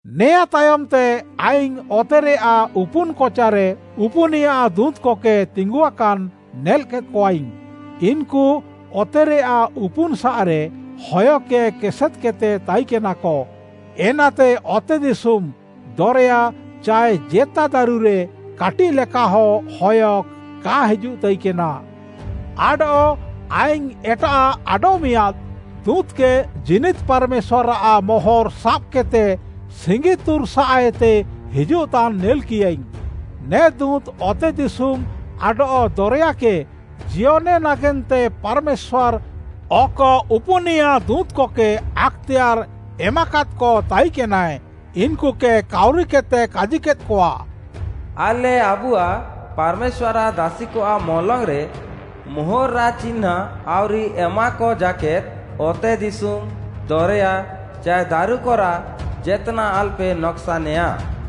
ନେଆଁ ତାୟମ୍‍ତେ ଆଇଙ୍ଗ୍‌ ଅତେରେୟାଃ ଉପୁନ୍‌ କଚାରେ ଉପୁନିୟା ଦୁଁତ୍‌କକେ ତିଙ୍ଗୁଆକାନ୍‌ ନେଲ୍‍କେଦ୍‍କଆଇଙ୍ଗ୍‌। ଇନ୍‌କୁ ଅତେରେୟାଃ ଉପୁନ୍‌ସାଃରେ ହୟକେ କେସେଦ୍‌କେଦ୍‌ତେ ତାଇକେନାକ। ଏନାତେ ଅତେଦିଶୁମ୍‌, ଦରେୟା ଚାଏ ଜେତା ଦାରୁରେ କାଟିଃଲେକାହଁ ହୟ କା ହିଜୁଃତାଇକେନା। ଆଡଃ ଆଇଙ୍ଗ୍‌ ଏଟାଃ ଆଡଃମିଆଁଦ୍‌ ଦୁଁତ୍‌କେ ଜୀନିଦ୍‌ ପାର୍‌ମେଶ୍ୱାର୍‌ଆଃ ମୋହର୍‌ ସାବ୍‌କେଦ୍‌ତେ ସିଙ୍ଗିତୁର୍‌ସାଃଏତେ ହିଜୁଃତାନ୍‌ ନେଲ୍‌କିୟାଇଙ୍ଗ୍‌। ନେ ଦୁଁତ୍‌ ଅତେଦିଶୁମ୍‌ ଆଡଃ ଦରେୟାକେ ଜିୟନେ ନାଗେନ୍ତେ ପାର୍‌ମେଶ୍ୱାର୍‌ ଅକ ଉପୁନିୟା ଦୁଁତ୍‌କକେ ଆକ୍‌ତେୟାର୍‌ ଏମାକାଦ୍‌କ ତାଇକେନାଏ, ଇନ୍‌କୁକେ କାଉରିକେଦ୍‌ତେ କାଜିକେଦ୍‌କଆ, “ଆଲେ ଆବୁଆଃ ପାର୍‌ମେଶ୍ୱାର୍‌ଆଃ ଦାସିକଆଃ ମଲଙ୍ଗ୍‌ରେ ମୋହର୍‌ରାଃ ଚିହ୍ନାଁଁ ଆଉରି ଏମାକ ଜାକେଦ୍‌ ଅତେଦିଶୁମ୍‌, ଦରେୟା ଚାଏ ଦାରୁକରାଃ ଜେତ୍‌ନାଃ ଆଲପେ ନକ୍‌ସାନେୟା।”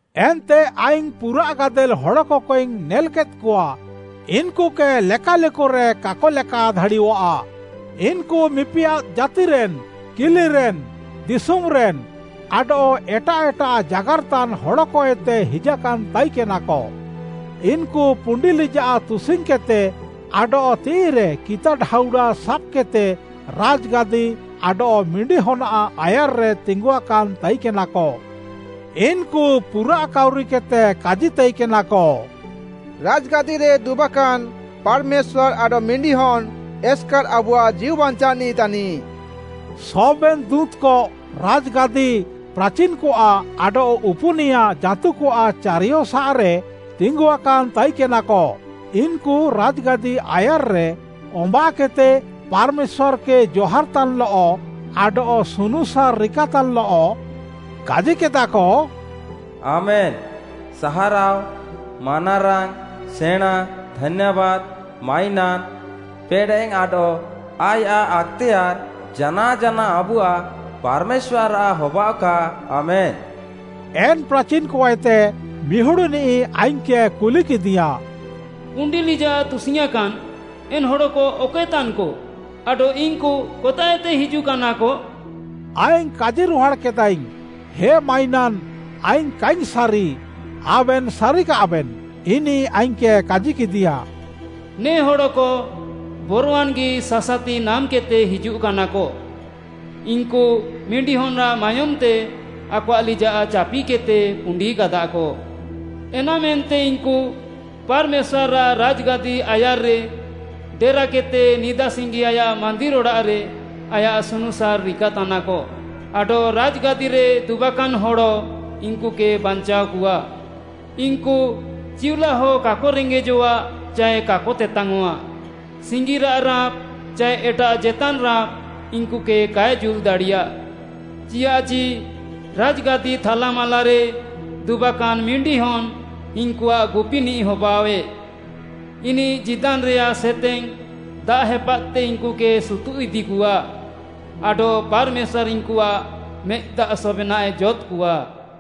ଏନ୍ତେ ଆଇଙ୍ଗ୍‌ ପୁରାଃ ଗାଦେଲ୍‌ ହଡ଼କକେଇଙ୍ଗ୍‌ ନେଲ୍‌କେଦ୍‌କଆ, ଇନ୍‌କୁକେ ଲେକାଲେକରେ କାକ ଲେକା ଦାଡ଼ିୟଃଆ। ଇନ୍‌କୁ ମିପିୟାଦ୍‌ ଜାତିରେନ୍‌, କିଲିରେନ୍‌, ଦିଶୁମ୍‌ରେନ୍‌, ଆଡଃ ଏଟାଃ ଏଟାଃ ଜାଗାର୍‌ତାନ୍‌ ହଡ଼କଏତେ ହିଜାକାନ୍‌ ତାଇକେନାକ। ଇନ୍‌କୁ ପୁଣ୍ଡି ଲିଜାଃ ତୁସିଙ୍ଗ୍‌କେଦ୍‌ତେ ଆଡଃ ତିଃଇରେ କିତା ଢାଉଡ଼ା ସାବ୍‌କେଦ୍‌ତେ, ରାଜ୍‌ଗାଦି ଆଡଃ ମିଣ୍ଡିହନ୍‌ଆଃ ଆୟାର୍‌ରେ ତିଙ୍ଗୁଆକାନ୍‌ ତାଇକେନାକ। ଇନ୍‌କୁ ପୁରାଃ କାଉରିକେଦ୍‌ତେ କାଜିତାଇକେନାକ, “ରାଜ୍‌ଗାଦିରେ ଦୁବାକାନ୍‌ ପାର୍‌ମେଶ୍ୱାର୍‌ ଆଡଃ ମିଣ୍ଡିହନ୍‌ ଏସ୍‌କାର୍‌ ଆବୁଆଃ ଜୀଉବାଞ୍ଚାଅନିଃ ତାନିଃ।” ସବେନ୍‌ ଦୁଁତ୍‌କ ରାଜ୍‌ଗାଦି, ପ୍ରାଚିନ୍‌କଆଃ, ଆଡଃ ଉପୁନିୟା ଜାଁତୁକଆଃ ଚାରିୟସାଃରେ ତିଙ୍ଗୁଆକାନ୍‌ ତାଇକେନାକ। ଇନ୍‌କୁ ରାଜ୍‌ଗାଦି ଆୟାର୍‌ରେ ଅମ୍ବାଃକେଦ୍‌ତେ ପାର୍‌ମେଶ୍ୱାର୍‌କେ ଜହାର୍‌ତାନ୍‌ଲଃ ଆଡଃ ସୁନୁସାର୍‌ ରିକାତାନ୍‌ଲଃ କାଜିକେଦାକ, “ଆମେନ୍‌! ସାହାରାଅ, ମାନାରାଙ୍ଗ୍‌, ସେଣାଁ, ଧାନ୍ୟାବାଦ୍‌, ମାଇନାନ୍‌, ପେଡ଼େଃ ଆଡଃ ଆୟାଃ ଆକ୍‌ତେୟାର୍‌ ଜାନାଅ ଜାନାଅ ଆବୁଆଃ ପାର୍‌ମେଶ୍ୱାର୍‌ଆଃ ହବାଅଃକା ଆମେନ୍‌!” ଏନ୍ ପ୍ରାଚିନ୍‌କଏତେ ମିହୁଡ଼୍‌ନିଃ ଆଇଙ୍ଗ୍‌କେ କୁଲିକେଦିୟାଁ, “ପୁଣ୍ଡି ଲିଜାଃ ତୁସିଙ୍ଗ୍‌ୟାଁକାନ୍‌ ଏନ୍‌ ହଡ଼କ ଅକଏତାନ୍‌କ? ଆଡଃ ଇନ୍‌କୁ କତାଃଏତେ ହିଜୁଃକାନାକ?” ଆଇଙ୍ଗ୍‌ କାଜିରୁହାଡ଼୍‌କେଦାଇଙ୍ଗ୍‌, “ହେ ମାଇନାନ୍‌, ଆଇଙ୍ଗ୍‌ କାଇଙ୍ଗ୍‌ ସାରି, ଆବେନ୍‌ ସାରିକାଃବେନ୍‌।” ଇନିଃ ଆଇଙ୍ଗ୍‌କେ କାଜିକେଦିୟାଁ, “ନେ ହଡ଼କ ବରୱାନ୍‌ଗି ସାସାତି ନାମ୍‌କେଦ୍‌ତେ ହିଜୁଃକାନାକ। ଇନ୍‌କୁ ମିଣ୍ଡିହନ୍‌ଆଃ ମାୟୋମ୍‌ତେ ଆକଆଃ ଲିଜାଃ ଚାପିକେଦ୍‌ତେ ପୁଣ୍ଡିକାଦାକ। ଏନାମେନ୍ତେ ଇନ୍‌କୁ ପାର୍‌ମେଶ୍ୱାର୍‌ଆଃ ରାଜ୍‌ଗାଦି ଆୟାର୍‌ରେ ଡେରାକେଦ୍‌ତେ ନିଦାସିଙ୍ଗି ଆୟାଃ ମାନ୍ଦିର୍‌ ଅଡ଼ାଃରେ ଆୟାଃ ସୁନୁସାର୍‌ ରିକାତାନାକ। ଆଡଃ ରାଜ୍‌ଗାଦିରେ ଦୁବାକାନ୍‌ ହଡ଼ ଇନ୍‌କୁକେ ବାଞ୍ଚାଅକଆ। ଇନ୍‌କୁ ଚିଉଲାହ କାକ ରେଙ୍ଗେଜଆଃ ଚାଏ କାକ ତେତାଙ୍ଗ୍‌ଅଃଆ, ସିଙ୍ଗିରାଃ ରାଁପ୍‌ ଚାଏ ଏଟାଃ ଜେତାନ୍‌ ରାଁପ୍‌ ଇନ୍‌କୁକେ କାଏ ଜୁଲ୍‌ ଦାଡ଼ିୟା। ଚିୟାଃଚି ରାଜ୍‌ଗାଦି ଥାଲାମାଲାରେ ଦୁବାକାନ୍‌ ମିଣ୍ଡିହନ୍‌ ଇନ୍‌କୁଆଃ ଗୁପିନିଃ ହବାଅଃଆଏ। ଇନିଃ ଜୀଦାନ୍‌ରେୟାଃ ସେତେଙ୍ଗ୍‌ ଦାଆଃ ହେପାଦ୍‌ତେ ଇନ୍‌କୁକେ ସୁତୁଃଇଦିକଆ ଆଡଃ ପାର୍‌ମେଶ୍ୱାର୍‌ ଇନ୍‌କୁଆଃ ମେଦ୍‌ଦାଆଃ ସବେନାଃଏ ଜଦ୍‌କଆ।”